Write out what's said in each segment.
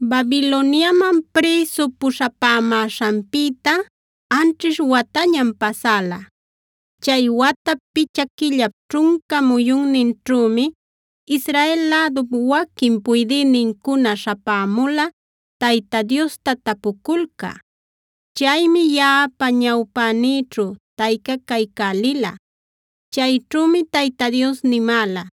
Babiloniaman prïsu puśhapämäśhanpïta anćhish watañam pasäla. Chay watap picha quillap ćhunca muyunninćhümi Israel lädup waquin puydïnincuna śhapämula Tayta Diosta tapuculcä. Chaymi yaꞌapa ñawpänïćhu taycacaycälila. Chayćhümi Tayta Dios nimäla: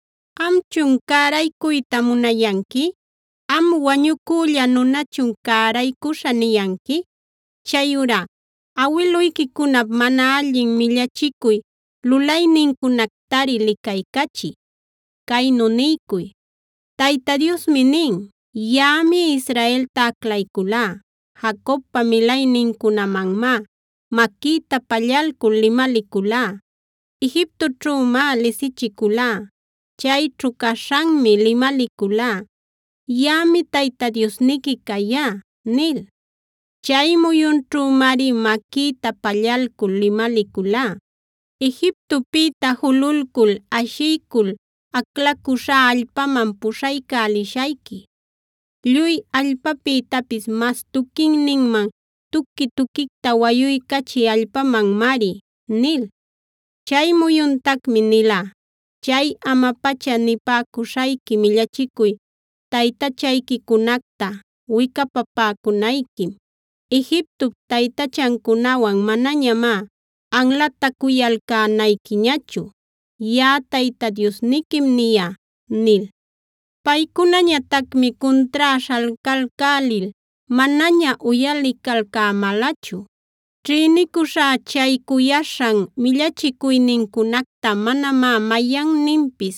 “¿Amchun cäraycuyta munayanqui? ¿Am wañucülla nunachun ‘cäraycuśhä’ niyanqui? Chayurá awiluyquicunap mana allin millachicuy lulaynincunactari licaycachiy. Caynu niycuy: Tayta Diosmi nin: ‘Yaꞌami Israelta aclayculá, Jacobpa milaynincunamanmá maquïta pallalcul limaliculá. Egiptoćhümá lisichiculá. Chayćhu caśhanmi limaliculá: “Yaꞌami Tayta Diosniqui cayá” ’ nil. Chay muyunćhümari maquïta pallalcul limaliculá: ‘Egiptopïta jululcul ashiycul aclaycuśhá allpaman puśhaycälishayqui, lluy allpapïtapis mas tuquinninman, tuqui-tuquicta wayuycachï allpamanmari’ nil. Chay muyuntacmi nilá: ‘Chay ama-pacha nipäcuśhayqui millachicuy taytachayquicunacta wicapapäcunayquim. Egiptop taytachancunawan manañamá anlatacuyalcänayquiñachu. Yaꞌa Tayta Diosniquim niyá’ nil. “Paycunañatacmi cuntrá śhalcalcälil manaña uyalicalcämälachu. Ćhïnicuśhá chay cuyaśhan millachicuynincunacta manamá mayanninpis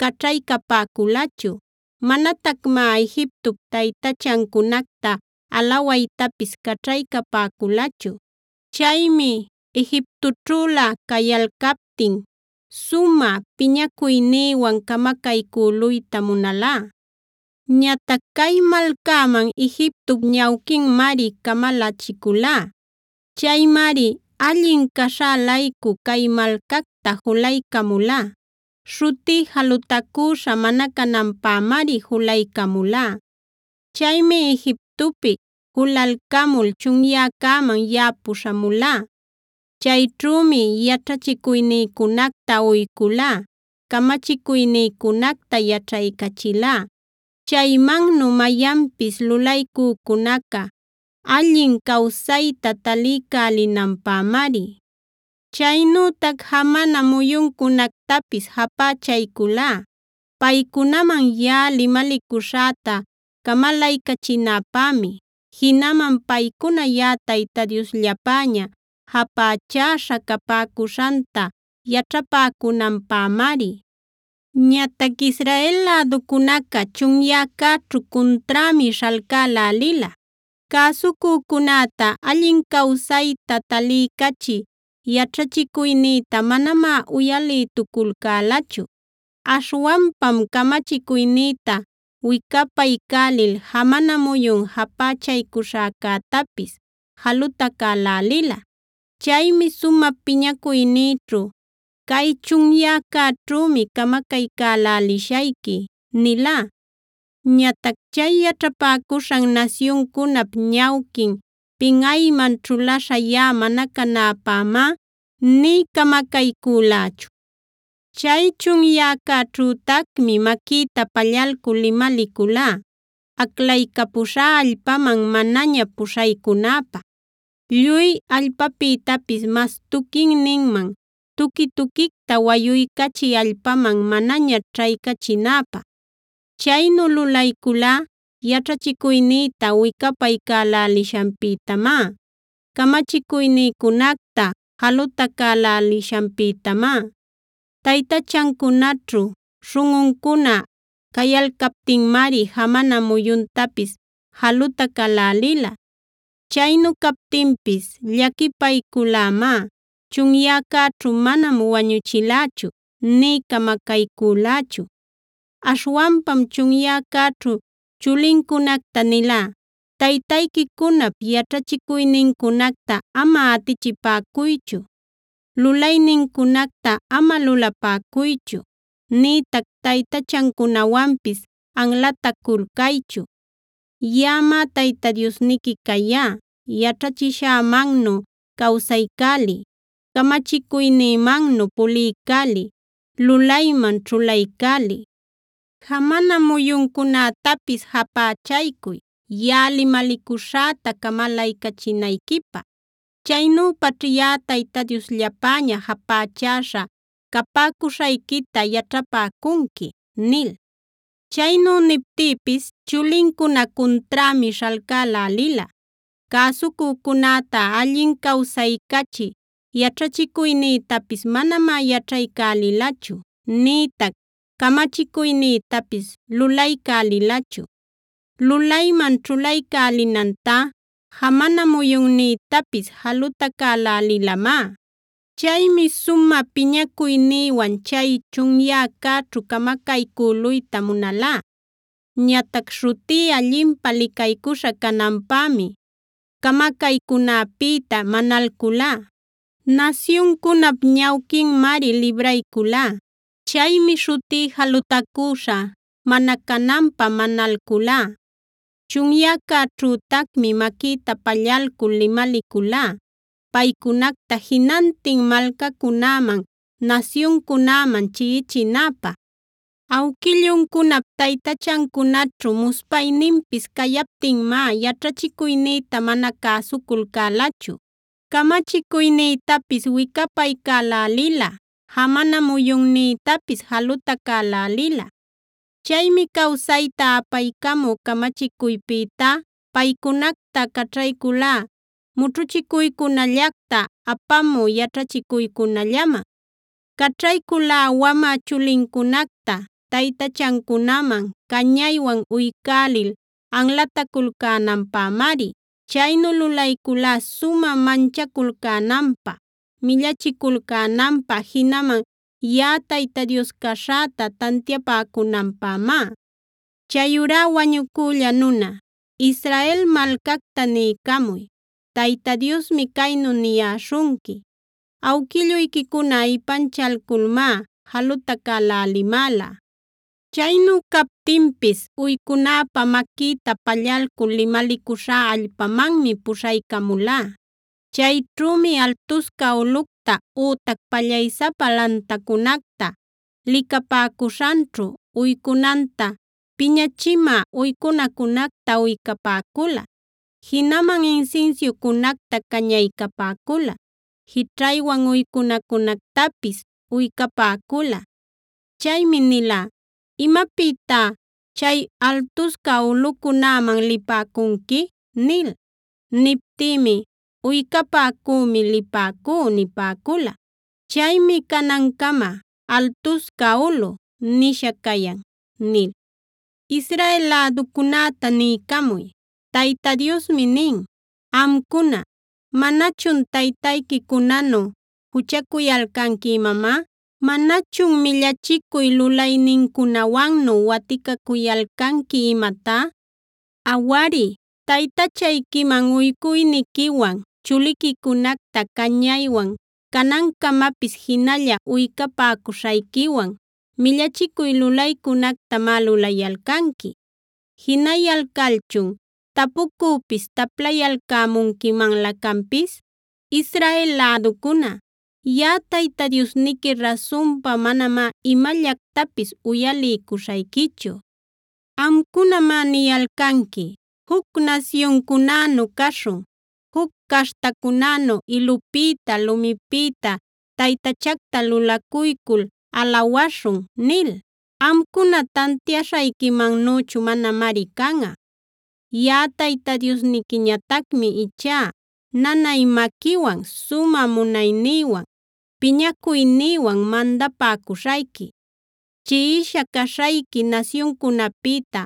caćhaycapäculachu; manatacmá Egiptop taytachancunacta alawaytapis caćhaycapäculachu. Chaymi Egiptoćhülä cayalcaptin sumä piñacuynïwan camacaycüluyta munalá. Ñatac cay malcäman Egiptop ñawquinmari camalachiculá. Chaymari allin caśhä-laycu cay malcacta julaycamulá. Śhutí jalutacüśha mana cananpämari julaycamulá. Chaymi Egiptopi julalcamul chunyäcäman yaꞌa puśhamulá. Chayćhümi yaćhachicuynïcunacta uyculá, camachicuynïcunacta yaćhaycachilá. Chaymannu mayanpis lulaycücunaca allin cawsayta taliycälinanpämari. Chaynütac jamana muyuncunactapis japächayculá paycunaman yaꞌa limalicuśhäta camalaycachinäpämi. Jinaman paycuna yaꞌa Tayta Diosllapäña japächäśha capäcuśhanta yaćhapäcunanpämari. “Ñatac Israel läducunaca chunyäcäćhu cunträmi śhalcälälila. Cäsucücunäta allin cawsayta taliycachï yaćhachicuynïta manamá uyalïtuculcälachu. Aśhwanpam camachicuynïta wicapaycälil jamana muyun japächaycuśhäcätapis jalutacälälila. Chaymi sumä piñacuynïćhu: ‘Cay chunyäcäćhümi camacaycälälishayqui’ nilá. Ñatac chay yaćhapäcuśhan nasyuncunap ñawquin pinꞌayman ćhulaśha yaꞌa mana canäpämá nï camacaycülächu. “Chay chunyäcäćhütacmi maquïta pallalcul limaliculá aclaycapuśhá allpaman manaña puśhaycunäpä, lluy allpapïtapis mas tuquinninman, tuqui-tuquicta wayuycachï allpaman manaña ćhaycachinäpä. Chaynu lulayculá yaćhachicuynïta wicapaycälälishanpïtamá; camachicuynïcunacta jalutacälälishanpïtamá. Taytachancunaćhu śhunꞌuncuna cayalcaptinmari jamana muyuntapis jalutacälälila. Chaynu captinpis llaquipayculämá; chunyäcäćhu manam wañuchilächu nï camacaycülächu. Aśhwanpam chunyäcäćhu chulincunacta nilá: ‘Taytayquicunap yaćhachicuynincunacta ama atichipäcuychu; lulaynincunacta ama lulapäcuychu nïtac taytachancunawanpis anlataculcaychu. Yaꞌamá Tayta Diosniqui cayá; yaćhachishämannu cawsaycäliy, camachicuynïmannu puliycälil lulayman ćhulaycäliy. Jamana muyuncunätapis japächaycuy yaꞌa limalicuśhäta camalaycachinayquipä. Chaynüpaćh yaꞌa Tayta Diosllapäña japächäśha capäcuśhayquita yaćhapäcunqui’ nil. “Chaynu niptïpis chulincuna cunträmi śhalcälälila. Cäsucücunäta allin cawsaycachï yaćhachicuynïtapis manamá yaćhaycälilachu, nïtac camachicuynïtapis lulaycälilachu. Lulayman ćhulaycälinantá jamana muyunnïtapis jalutacälälilamá. Chaymi sumä piñacuynïwan chay chunyäcäćhu camacaycüluyta munalá. Ñatac śhutí allinpä licaycuśha cananpämi camacaycunäpïta manalculá. Nasyuncunap ñawquinmari librayculá. Chaymi śhutí jalutacüśha mana cananpä manalculá. Chunyäcäćhütacmi maquïta pallalcul limaliculá paycunacta jinantin malcacunäman, nasyuncunäman chiꞌichinäpä. Awquilluncunap taytachancunaćhu muspayninpis cayaptinmá yaćhachicuynïta mana cäsuculcälachu, camachicuynïtapis wicapaycälälila, jamana muyunnïtapis jalutacälälila. Chaymi cawsayta apaycamü camachicuypïtá, paycunacta caćhayculá mućhuchicuycunallacta apamü yaćhachicuycunallaman. Caćhayculá wamä chulincunacta taytachancunaman cañaywan uycälil anlataculcänanpämari; chaynu lulayculá sumä manchaculcänanpä, millachiculcänanpä jinaman yaꞌa Tayta Dios caśhäta tantiapäcunanpämá. “Chayurá wañucülla nuna, Israel malcacta niycamuy: Tayta Diosmi caynu niyäśhunqui: ‘Awquilluyquicuna ipanchalculmá jalutacälälimäla. Chaynu captinpis uycunäpä maquïta pallalcul limalicuśhá allpamanmi puśhaycamulá. Chayćhümi altusca ulꞌucta ütac pallaysapa lantacunacta licapäcuśhanćhu uycunanta, piñachimä uycunacunacta uycapäcula, jinaman insinsiucunacta cañaycapäcula, jićhaywan uycunacunactapis uycapäcula. Chaymi nilá: “¿Imapïtá chay altusca ulꞌucunäman lipäcunqui?” nil. Niptïmi: “Uycapäcümi lipäcú” nipäcula. Chaymi canancama “Altusca Ulꞌu”a nisha cayan’ nil. “Israel läducunäta niycamuy: Tayta Diosmi nin: ‘Amcuna, ¿manachun taytayquicunanu juchacuyalcanqui imamá? ¿Manachun millachicuy lulaynincunawannu waticacuyalcanqui imatá? Awari, taytachayquiman uycuyniquiwan, chuliquicunacta cañaywan canancamapis jinalla uycapäcuśhayquiwan millachicuy lulaycunactamá lulayalcanqui. Jinayalcalchun, ¿tapucüpis taplayalcämunquimanlä canpis? Israel läducuna, yaꞌa Tayta Diosniqui rasunpa manamá imallactapis uyaliycuśhayquichu. “ ‘Amcunamá niyalcanqui: “Juc nasyuncunänu caśhun; juc caśhtacunänu ilupïta, lumipïta taytachacta lulacuycul alawaśhun” nil. Amcuna tantiaśhayquimannüchu manamari canꞌa. Yaꞌa Tayta Diosniquiñatacmi ichá nanay maquiwan, sumä munaynïwan, piñacuynïwan mandapäcuśhayqui. Chiꞌisha caśhayqui nasyuncunapïta,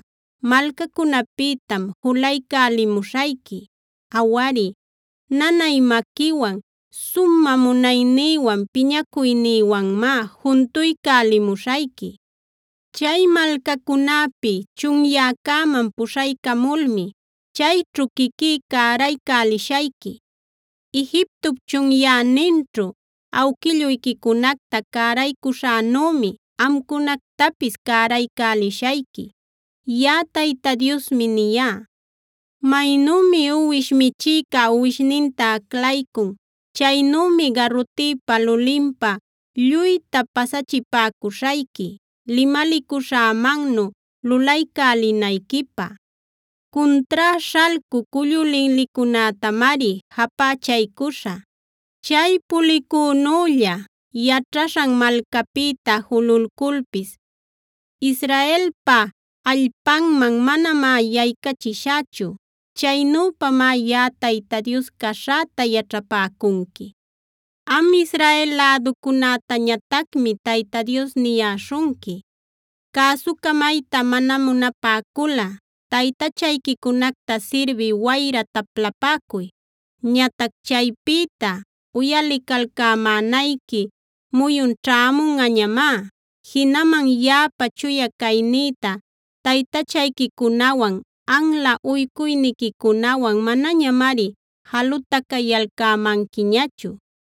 malcacunapïtam julaycälimuśhayqui. Awari, nanay maquiwan, sumä munaynïwan, piñacuynïwanmá juntuycälimuśhayqui. Chay malcacunapi chunyäcäman puśhaycamulmi chayćhu quiquí cäraycälishayqui. Egiptop chunyäninćhu awquilluyquicunacta cäraycuśhänümi amcunactapis cäraycälishayqui. Yaꞌa Tayta Diosmi niyá. Maynümi uwish michïca uwishninta aclaycun, chaynümi garutïpa lulinpa lluyta pasachipäcuśhayqui limalicuśhämannu lulaycälinayquipä. Cuntrá śhalcü cullu linlicunätamari japächaycuśhä. Chay pulicünülla yaćhaśhan malcapïta jululculpis Israelpa allpanman manamá yaycachishächu. Chaynüpamá yaꞌa Tayta Dios caśhäta yaćhapäcunqui. “ ‘Am Israel läducunätañatacmi Tayta Dios niyäśhunqui: Cäsucamayta mana munapäculꞌa taytachayquicunacta sirbï wayra taplapäcuy. Ñatac chaypïta uyalicalcämänayqui muyun ćhämunꞌañamá; jinaman yaꞌapa chuya caynïta taytachayquicunawan, anla uycuyniquicunawan manañamari jalutacayalcämanquiñachu.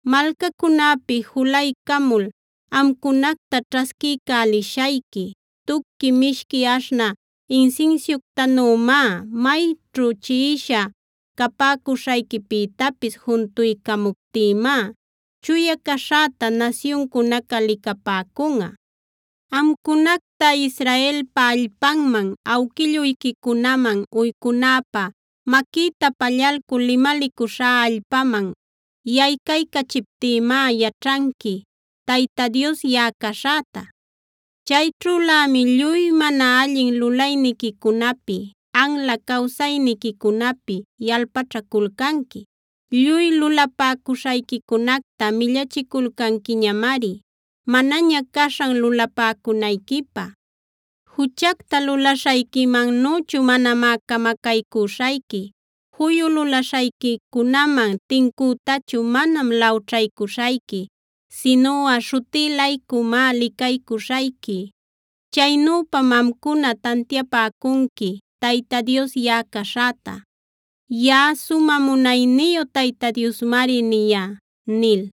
Malcacunäpi julaycamul amcunacta ćhasquiycälishayqui tuqui mishqui aśhnä insinsiuctanümá. Mayćhu chiꞌisha capäcuśhayquipïtapis juntuycamuptïmá chuya caśhäta nasyuncunaca licapäcunꞌa. Amcunacta Israelpa allpanman, awquilluyquicunaman uycunäpä maquïta pallalcul limalicuśhá allpaman yaycaycachiptïmá yaćhanqui Tayta Dios yaꞌa caśhäta. Chayćhülämi lluy mana allin lulayniquicunapi, anla cawsayniquicunapi yalpaćhaculcanqui. Lluy lulapäcuśhayquicunacta millachiculcanquiñamari, manaña caśhan lulapäcunayquipä. Juchacta lulaśhayquimannüchu manamá camacaycüśhayqui, juyu lulaśhayquicunaman tincütachu manam lawćhaycuśhayqui, sinuꞌa śhutí-laycumá licaycuśhayqui. Chaynüpam amcuna tantiapäcunqui Tayta Dios yaꞌa caśhäta. Yaꞌa sumä munayniyu Tayta Diosmari niyá’” nil.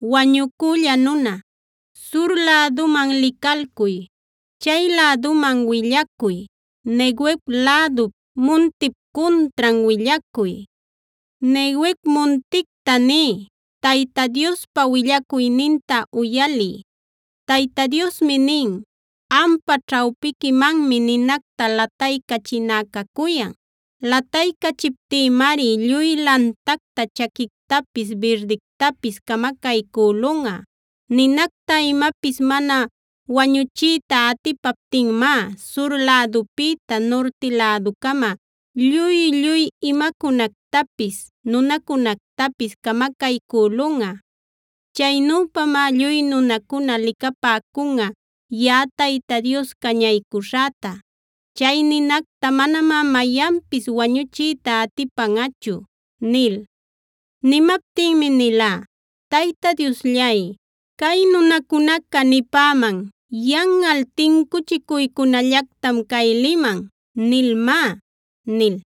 “Wañucülla nuna, sur läduman licalcuy; chay läduman willacuy, Neguev lädu muntip cuntran willacuy. Neguev munticta niy: ‘Tayta Diospa willacuyninta uyaliy: Tayta Diosmi nin: Ampa ćhawpiquimanmi ninacta lataycächiná cacuyan. Lataycachiptïmari lluy lantacta chaquictapis birdictapis camacaycülunꞌa. Ninacta imapis mana wañuchiyta atipaptinmá, sur lädupïta nurti läducama lluy-lluy imacunactapis, nunacunactapis camacaycülunꞌa. Chaynüpamá lluy nunacuna licapäcunꞌa yaꞌa Tayta Dios cañaycuśhäta. Chay ninacta manamá mayanpis wañuchiyta atipanꞌachu’” nil. Nimaptinmi nilá: “Tayta Diosllay, cay nunacunaca nipäman: ‘Yanꞌal tincuchicuycunallactam cay liman’ nilmá” nil.